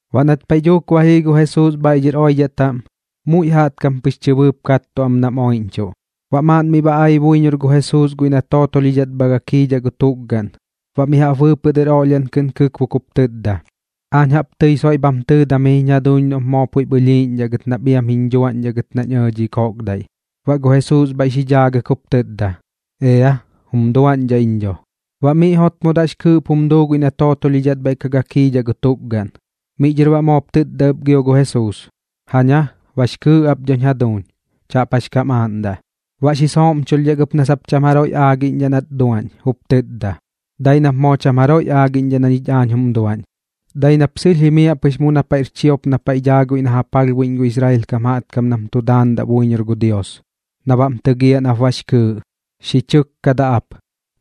Baꞌ nat paiꞌ dhuuk ba jii gu Jesuus bhaiꞌ dhɨr oidhaꞌ taꞌm, muiꞌ jaꞌtkam pɨx chɨbɨɨp kattuꞌ am nam oiꞌñchuꞌ. Baꞌ maaꞌn miꞌ ba ai buiñor gu Jesuus guiꞌ na tootolhidhat bha gakiidhaꞌ gu tukgaꞌn, baꞌ mi jaꞌp bɨɨpɨꞌ dɨr oꞌlhiaꞌn kɨꞌn xi kɨkbok jup tɨtda: ―Aañ jaꞌp tɨi soiꞌ bham tɨɨdam jiñ jaduuñ noꞌp moo puiꞌp ɨlhiiꞌñdhaꞌ gɨt nap iam jiñ dhuaꞌñdhaꞌ gɨt nañ ɇɇ dhi koꞌkdaiꞌ. Baꞌ gu Jesuus bhaiꞌ xi dhaagɨk jup tɨtda: ―Ea, jum duaꞌñdhaꞌ iñ dho. Baꞌ miꞌ jotmodaꞌ jix kɨɨꞌp jum duu guiꞌ na tootolhidhat bhaiꞌ ka gakiidhat gu tukgaꞌn. Miꞌ dhɨr baꞌ moop tɨtda ɨp gio gu Jesuus: ―Jaña, bax kɨɨꞌ ap dhoñ jaduuñ. Chaꞌp jax kam aaꞌndaꞌ. Baꞌ xi sooꞌmchulhdhak ɨp na sap cham jaroiꞌ aagiꞌñdhaꞌ nat duaꞌñ, jup tɨtda: ―Dai nap moo cham jaroiꞌ aagiꞌñdhaꞌ na ñich aañ jum duaꞌñ. Dai nap sɨlh jimiaꞌ pɨx mu na paiꞌr chiop na paiꞌ daa guiꞌ na ja palhbuiꞌñ gu Israel kam jaꞌtkam nam tu daandaꞌ buiñor gu Dios, na baꞌm tɨgiaꞌ nap bax kɨɨꞌ. Xi chɨkkadaꞌ ap.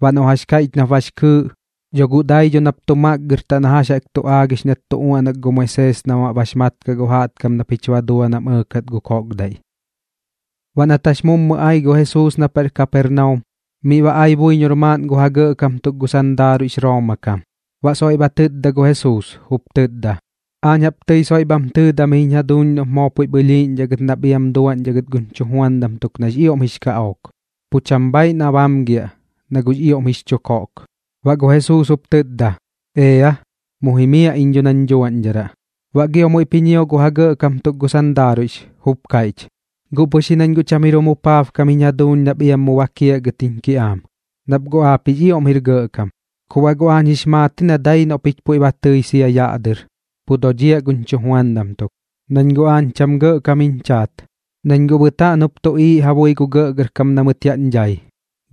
Baꞌ noꞌ jax kaiꞌch nap bax kɨɨꞌ, dho guꞌ dai dho nap tu makgɨrtaꞌ na jax tu aagix nat tu uaꞌnak gu Moisees nam baꞌ bax mat kaꞌ gu jaꞌtkam na pich ba dua na kam ɇɇkat gu koꞌkdaiꞌ. Baꞌ nat jax mummɨ ai gu Jesuus na paiꞌr Kapernaum, miꞌ ba ai buiñor maaꞌn gu ja gɇꞌkam tuk gu sandaaruiꞌx Rooma kam. Baꞌ soiꞌ ba tɨtda gu Jesuus, jup tɨtda: ―Aañ jaꞌp tɨi soiꞌ bham tɨɨdam jiñ jaduuñ noꞌp moo puiꞌp ɨlhiiꞌñdhaꞌ gɨt nap iam duaꞌñdhaꞌ gɨt guñ chujuandam tuk nax ioꞌm jix kaꞌook. Pu cham bhaaiꞌ na bamgiaꞌ, na guꞌx ioꞌm jix chu koꞌk. Baꞌ gu Jesuus jup tɨtda: ―Ea, mu jimiaꞌ iñ dho nañ dhuaꞌñdharaꞌ. Baꞌ gio muiꞌp ji ñio gu ja gɇꞌkam tuk gu sandaaruiꞌx, jup kaiꞌch: ―Guꞌ pɨx ji nañ guꞌ cham jir jum jupaabkam jiñ jaduuñ nap iam mu bakiaꞌ gɨt jiñ kiꞌaam, nap guꞌ aap jix ioꞌm jir gɇꞌkam. Ku baꞌ guꞌ aañ jix maat ji na dai noꞌ pich puiꞌ ba tɨi sia yaꞌ dɨr, pu dodhiaꞌ guñ chujuandam tuk. Nañ guꞌ aañ cham gɇꞌkam jiñ chaat, nañ guꞌ bɨtaꞌn jup tuꞌiiꞌ ja bui gu gɇꞌgɇrkam na mɨt yaꞌñ dhai.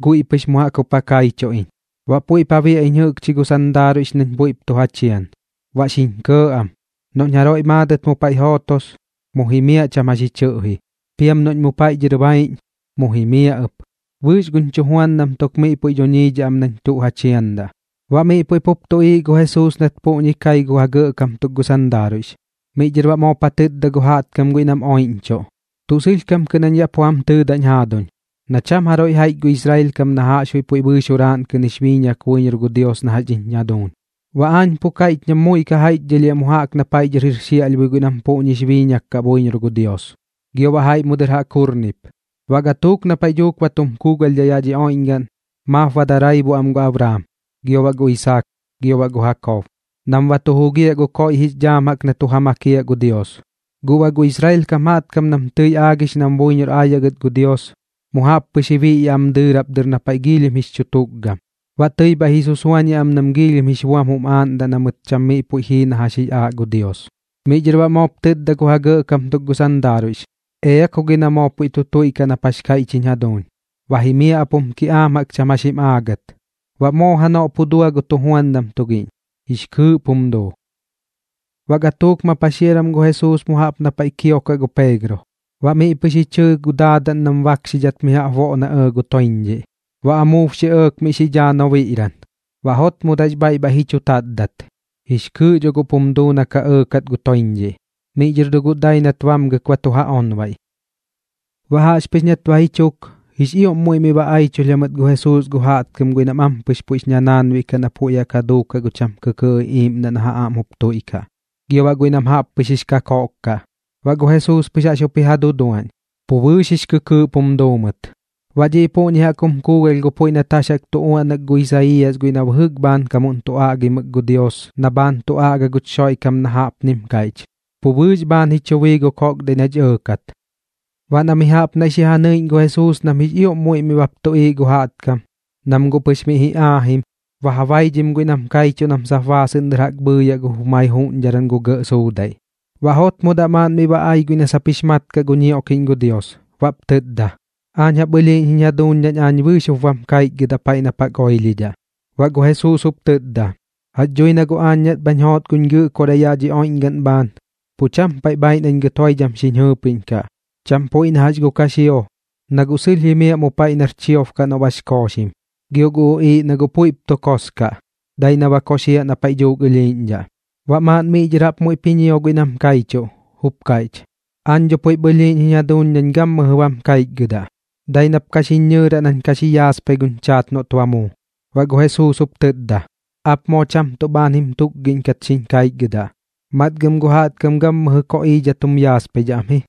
Guiꞌ pɨx mu jaꞌk jup ja kaichuꞌ iñ. Baꞌ puiꞌp ja biaꞌ iñ jɨꞌkchi gu sandaaruiꞌx nañ puiꞌp tu ja chian, baꞌ xiñ kɇɇ am. Noꞌñ jaroiꞌ maadɨt mu paiꞌ jootos, mu jimiaꞌ cham jax ji chɨꞌji. Piam noꞌñ mu paiꞌ dhɨr baiꞌñ, mu jimiaꞌ ɨp. Bɨɨx guñ chujuandam tuk miꞌ puiꞌ duñiidhaꞌ am nañ tuꞌ ja chiandaꞌ. Baꞌ miꞌ puiꞌ pup tuꞌiiꞌ gu Jesuus nat puꞌñi kai gu ja gɇꞌkam tuk gu sandaaruiꞌx. Miꞌ dhɨr baꞌ moop ja tɨtda gu jaꞌtkam guiꞌ nam oiꞌñchuꞌ: ―Tuꞌ sɨlhkam kɨꞌn jañ yaꞌ pu jam tɨtdañ jaaduñ na cham jaroiꞌ jaiꞌch gu Israel kam na jaꞌxbuiꞌ puiꞌ bɨɨx juraaꞌn kɨꞌn jix biiñak buiñor gu Dios na jax dhiñ jaduuñ. Baꞌ aañ pu kaiꞌch nam muiꞌ ka jaiꞌchdhɨlhiaꞌ mu jaꞌk na paiꞌ dhɨr jir xiaꞌlhbui guiꞌ nam puꞌñix biiñak kaꞌ buiñor gu Dios, gio baꞌ jaiꞌ mu dɨr jaꞌk jurnip. Baꞌ gatuuk na paiꞌ dhuuk ba tum kuugalhdhaꞌ yaꞌ dhi oiꞌñgaꞌn, maap ba daraibuꞌ am gu Abraam, gio baꞌ gu Isaak, gio baꞌ gu Jakob, nam ba tu jugiaꞌ gu koiꞌ jix dhaam jaꞌk na tu ja makiaꞌ gu Dios. Guꞌ baꞌ gu Israel kam jaꞌtkam nam tɨi aagix nam buiñor aayaꞌ gɨt gu Dios, mu jaꞌp pɨx ji biꞌyaꞌ am dɨɨrap dɨr na paiꞌ giilhim jix chu tukgam, baꞌ tɨi bhaiꞌ ji susuañiaꞌ am nam giilhim jix buam jum aaꞌndaꞌ na mɨt cham miꞌ puiꞌ jii na jax jix aaꞌ gu Dios. Miꞌ dhɨr baꞌ moop tɨtda gu ja gɇꞌkam tuk gu sandaaruiꞌx: ―Ea ku gi na moo puiꞌ tu tuiꞌkaꞌ nap jax kaiꞌch jiñ jaduuñ. Ba jimiaꞌ ap jum kiꞌaam jaꞌk cham jax jim aagɨt. Baꞌ moo janoꞌ pu dua gu tujuandam tugiꞌñ, jix kɨɨꞌp jum duu. Baꞌ gatuuk ma paxiaram gu Jesuus mu jaꞌp na paiꞌ kiokaꞌ gu Peegro. Baꞌ miꞌ pɨx ji chɨɨ gu daadaꞌn nam bakxidhat mi jaꞌp boꞌ na ɇɇ gu toiñdhiꞌ. Baꞌ amuub xi ɇɇk miꞌ xi dhaa nobiꞌran. Baꞌ jotmodaꞌ jix bhaiꞌ ji chu tatdat, jix kɨɨꞌ dho guꞌp jum duu na ka ɇɇkat gu toiñdhiꞌ. Miꞌ dhɨr dho guꞌ dai nat bamgɨk ba tu ja onbaiꞌ. Baꞌ jaꞌxpɨx nat ba ji chuk, jix ioꞌm muiꞌ miꞌ ba aichulh jamɨt gu Jesuus gu jaꞌtkam guiꞌ nam ampɨx puiꞌx ñanaanbiꞌ kaꞌ na puiꞌ jaꞌk ja duukaꞌ gu cham kɨkɨɨꞌ iꞌiiꞌmdaꞌ na ja aꞌm jup tuiꞌkaꞌ, gio baꞌ jaiꞌ guiꞌ nam jaꞌppɨx jix kakoꞌk kaꞌ. Baꞌ gu Jesuus pɨx jaꞌx jup ji ja duduaꞌñ, pu bɨɨx jix kɨkɨɨꞌp jum duu mɨt. Baꞌ dhiꞌ puꞌñi jaꞌk jum kuugalh gu puiꞌ nat jax jaꞌk tu uaꞌnak gu Isaiiyas guiꞌ na bɨjɨk bhaankamuꞌn tu aꞌgimɨk gu Dios na bhaan tu aꞌga guch Xoiꞌkam na jaꞌpnim kaiꞌch: “Pu bɨɨx bhaan ji chu bii gu koꞌkdaiꞌ na kach ɇɇkat.” Baꞌ na mi jaꞌp naiꞌ xi ja nɨiꞌñ gu Jesuus nam jix ioꞌm muiꞌ miꞌ baꞌp tuꞌiiꞌ gu jaꞌtkam, nam guꞌ pɨx miꞌ ji aajim, ba ja baidhim guiꞌ nam kaichuꞌ nam sap baasɨꞌn dɨr jaꞌk bhɨɨyaꞌ gu jumai juꞌñdharan gu gɇꞌ suudaiꞌ. Baꞌ jotmodaꞌ maaꞌn miꞌ ba ai guiꞌ na sap jix mat kaꞌ gu ñioꞌkiꞌñ gu Dios, baꞌp tɨtda: ―Aañ jaꞌp ɨlhiiꞌñ jiñ jaduuñ nañ aañ bɨɨx jup bam kaichgɨdaꞌ paiꞌ nap jaꞌk oilhidhaꞌ. Baꞌ gu Jesuus jup tɨtda: ―Jax dhui na guꞌ aañ nat bhañ joot guñ Gɨꞌkoraꞌ yaꞌ dhi oiꞌñgaꞌn bhaan, pu cham paiꞌ bhaaiꞌ nañ gɨt joidham xiñ jɨɨpiꞌñkaꞌ, cham puiꞌ na jax gu kaxio, na guꞌ sɨlh jimiaꞌ mu paiꞌ nar chiob kaꞌ noꞌ bax kooxim. Gio gu uꞌiiꞌ na guꞌ puiꞌp tu kos kaꞌ, dai na ba koxiaꞌ na paiꞌ dhuuk ɨlhiiꞌñdhaꞌ. Baꞌ maaꞌn miꞌ dhɨr jaꞌp muiꞌp ji ñio guiꞌ nam kaichuꞌ, jup kaiꞌch: ―Aañ dho puiꞌp ɨlhiiꞌñ jiñ jaduuñ nañ gammɨjɨ bam kaichgɨdaꞌ. Dai nap ka xiñ ñɨɨraꞌ nañ ka xi yaaspai guñ chaat noꞌt ba muu. Baꞌ gu Jesuus jup tɨtda: ―Aap moo cham tuꞌ bhaan jim tukgidhat xiñ kaichgɨdaꞌ. Matgɨm gu jaꞌtkam gammɨjɨ koꞌiidhat jum yaaspaidhaꞌ am ji.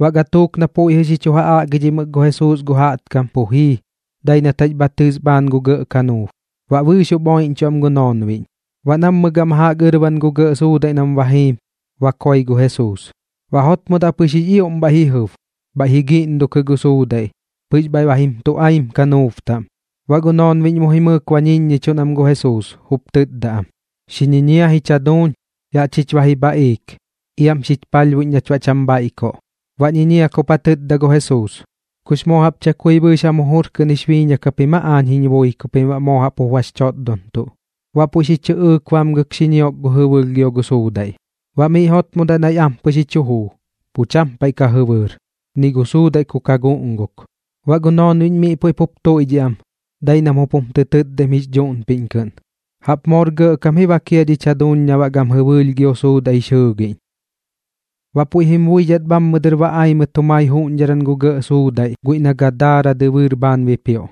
Baꞌ gatuuk na miꞌ puiꞌ jɨꞌ xi chu ja aꞌgidhimɨk gu Jesuus gu jaꞌtkam pu jii, dai nat jax bha tɨs bhaan gu gɇꞌ kanuub, baꞌ bɨɨx jup oiꞌñchuꞌ am gu noonbiꞌñ. Baꞌ nammɨ gama jaꞌk ɨrban gu gɇꞌ suudaiꞌ nam ba jiim, ba koi gu Jesuus. Baꞌ jotmodaꞌ pɨx jix ioꞌm bhaiꞌ jɨb, bhaiꞌ ji guꞌngukɨ gu suudaiꞌ, pɨx bhaiꞌ ba jim tuꞌaim kanuub taꞌm. Baꞌ gu noonbiꞌñ mu jimɨɨk ba ñiññichuꞌn am gu Jesuus, jup tɨtda am: ―¡Xi ñiñia jich jaduuñ! ¡Yaꞌ chich ba ji bhaꞌiik! ¡Iam xich palhbuiꞌñ nach baꞌ cham bhaiꞌkoꞌ! Baꞌ ñiñiak jup ja tɨtda gu Jesuus: ―¿Kux moo jaꞌp chakui bɨɨx jam jujur kɨꞌn jix biiñak japim aa aañ jiñ bui ku pim baꞌ moo jaꞌp jup bax chotdontuꞌ? Baꞌ puiꞌ xi chɨꞌɨɨk bamgɨk xi ñiok gu jɨbɨɨlh gio gu suudaiꞌ. Baꞌ miꞌ jotmodaꞌ naiꞌ ampɨx ji chu juu, pu cham paiꞌ ka jɨbɨɨr, ni gu suudaiꞌ ku ka guꞌnguk. Baꞌ gu noonbiꞌñ miꞌ puiꞌ pup tuiꞌdhiꞌ am, dai nam jup jum tɨ tɨtdaim jix dhuꞌnpiꞌñ kɨꞌn: ―¡Jaꞌp moor gɇꞌkam ji bak jia dhich jaduuñ na baꞌ gam jɨbɨɨlh gio suudaiꞌ jix jɨɨgiꞌñ! Baꞌ puiꞌ jim buidhat bhammɨ dɨr ba ai mɨt jumai juꞌñdharan gu gɇꞌ suudaiꞌ guiꞌ na Gadaara dɨbɨɨr bhaan bipioꞌ.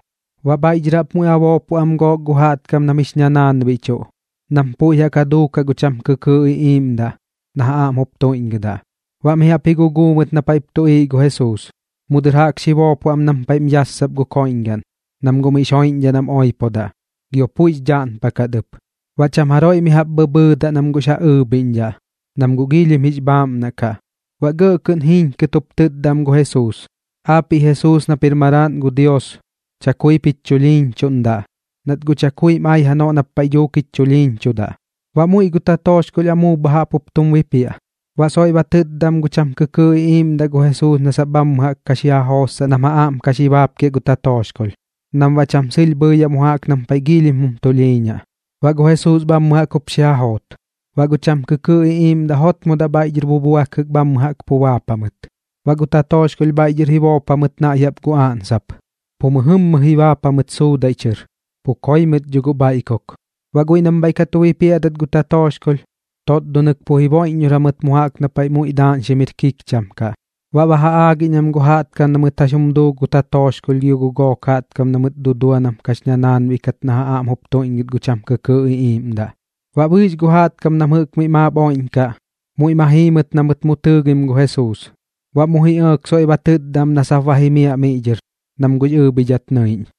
Baꞌ bhaiꞌ dhɨr jaꞌp muiꞌ ba boopoꞌ am gook gu jaꞌtkam nam jix ñanaanbiꞌchuꞌ, nam puiꞌ jaꞌk ja duukaꞌ gu cham kɨkɨɨꞌ iꞌiiꞌmdaꞌ na ja aꞌm jup tuiꞌñgɨdaꞌ, baꞌ mi jaꞌp ji guguu mɨt na paiꞌp tuꞌiiꞌ gu Jesuus. Mu dɨr jaꞌk xi boopoꞌ am nam paiꞌm yassapdaꞌ gu koiꞌñgaꞌn, nam guꞌ miꞌx joiꞌñdhaꞌ nam oipodaꞌ, gio puiꞌx dhaꞌnpakat ɨp. Baꞌ cham jaroiꞌ mi jaꞌp bhɨbhɨɨdaꞌ nam guꞌx ja ɨɨbhiꞌñdhaꞌ, nam guꞌ giilhim jix bhaaꞌmnaꞌ kaꞌ. Baꞌ gɇꞌ kɨꞌn jiiñkɨt jup tɨtda am gu Jesuus: ―¡Aapiꞌ Jesuus nap jir Maraaꞌn gu Dios, chakuip jich chulhiiñchuꞌndaꞌ, nat guꞌ chakuim ai janoꞌ nap paiꞌ dhuuk jich chulhiiñchudaꞌ! Baꞌ muiꞌ gu tatooxkolh amuub bha jaꞌp jup tum bipiaꞌ. Baꞌ soiꞌ ba tɨtda am gu cham kɨkɨɨꞌ iꞌiiꞌmdaꞌ gu Jesuus na sap bhammɨ jaꞌk ka xi ja jootsaꞌ nam ja aꞌm ka xi baapkiaꞌ gu tatooxkolh, nam baꞌ cham jimiaꞌ mu jaꞌk nam paiꞌ giilhim jum tulhiiñaꞌ. Baꞌ gu Jesuus bhammɨ jaꞌk jup xi ja joot. Baꞌ gu cham kɨkɨɨꞌ iꞌiiꞌmdaꞌ jotmodaꞌ bhaiꞌ dhɨr bubuakɨk bhammɨ jaꞌk pu baap jamɨt. Baꞌ gu tatooxkolh bhaiꞌ dhɨr ji boop jamɨt naiꞌ gu aꞌnsap, pu mɨjɨmmɨ ji baap jamɨt suudaiꞌ chɨr, pu koi mɨt dho guꞌ bhaiꞌkuk. Baꞌ guiꞌ nam bhaiꞌ ka tu bipiaꞌdat gu tatooxkolh, totdonɨk pu jiboiꞌññor jamɨt mu jaꞌk na paiꞌ muiꞌ daaꞌñxim jir kikcham kaꞌ, baꞌ ba ja aagiꞌñ am gu jaꞌtkam na mɨt jax jum duu gu tatooxkolh gio gu gook gu jaꞌtkam na mɨt dudua nam kax ñanaanbiꞌ kat na ja aꞌm jup tuiꞌñgɨt gu cham kɨkɨɨꞌ iꞌiiꞌmdaꞌ. Baꞌ bɨɨx gu jaꞌtkam nam jɨꞌk miꞌ maap oiꞌñkaꞌ, muiꞌ ma jii mɨt na mɨt mu tɨɨgim gu Jesuus. Baꞌ mu ji ɇɇk soiꞌ ba tɨtda am na sap ba jimiaꞌ miꞌ dhɨr, nam guꞌx ɨɨbhidhat nɨiꞌñ.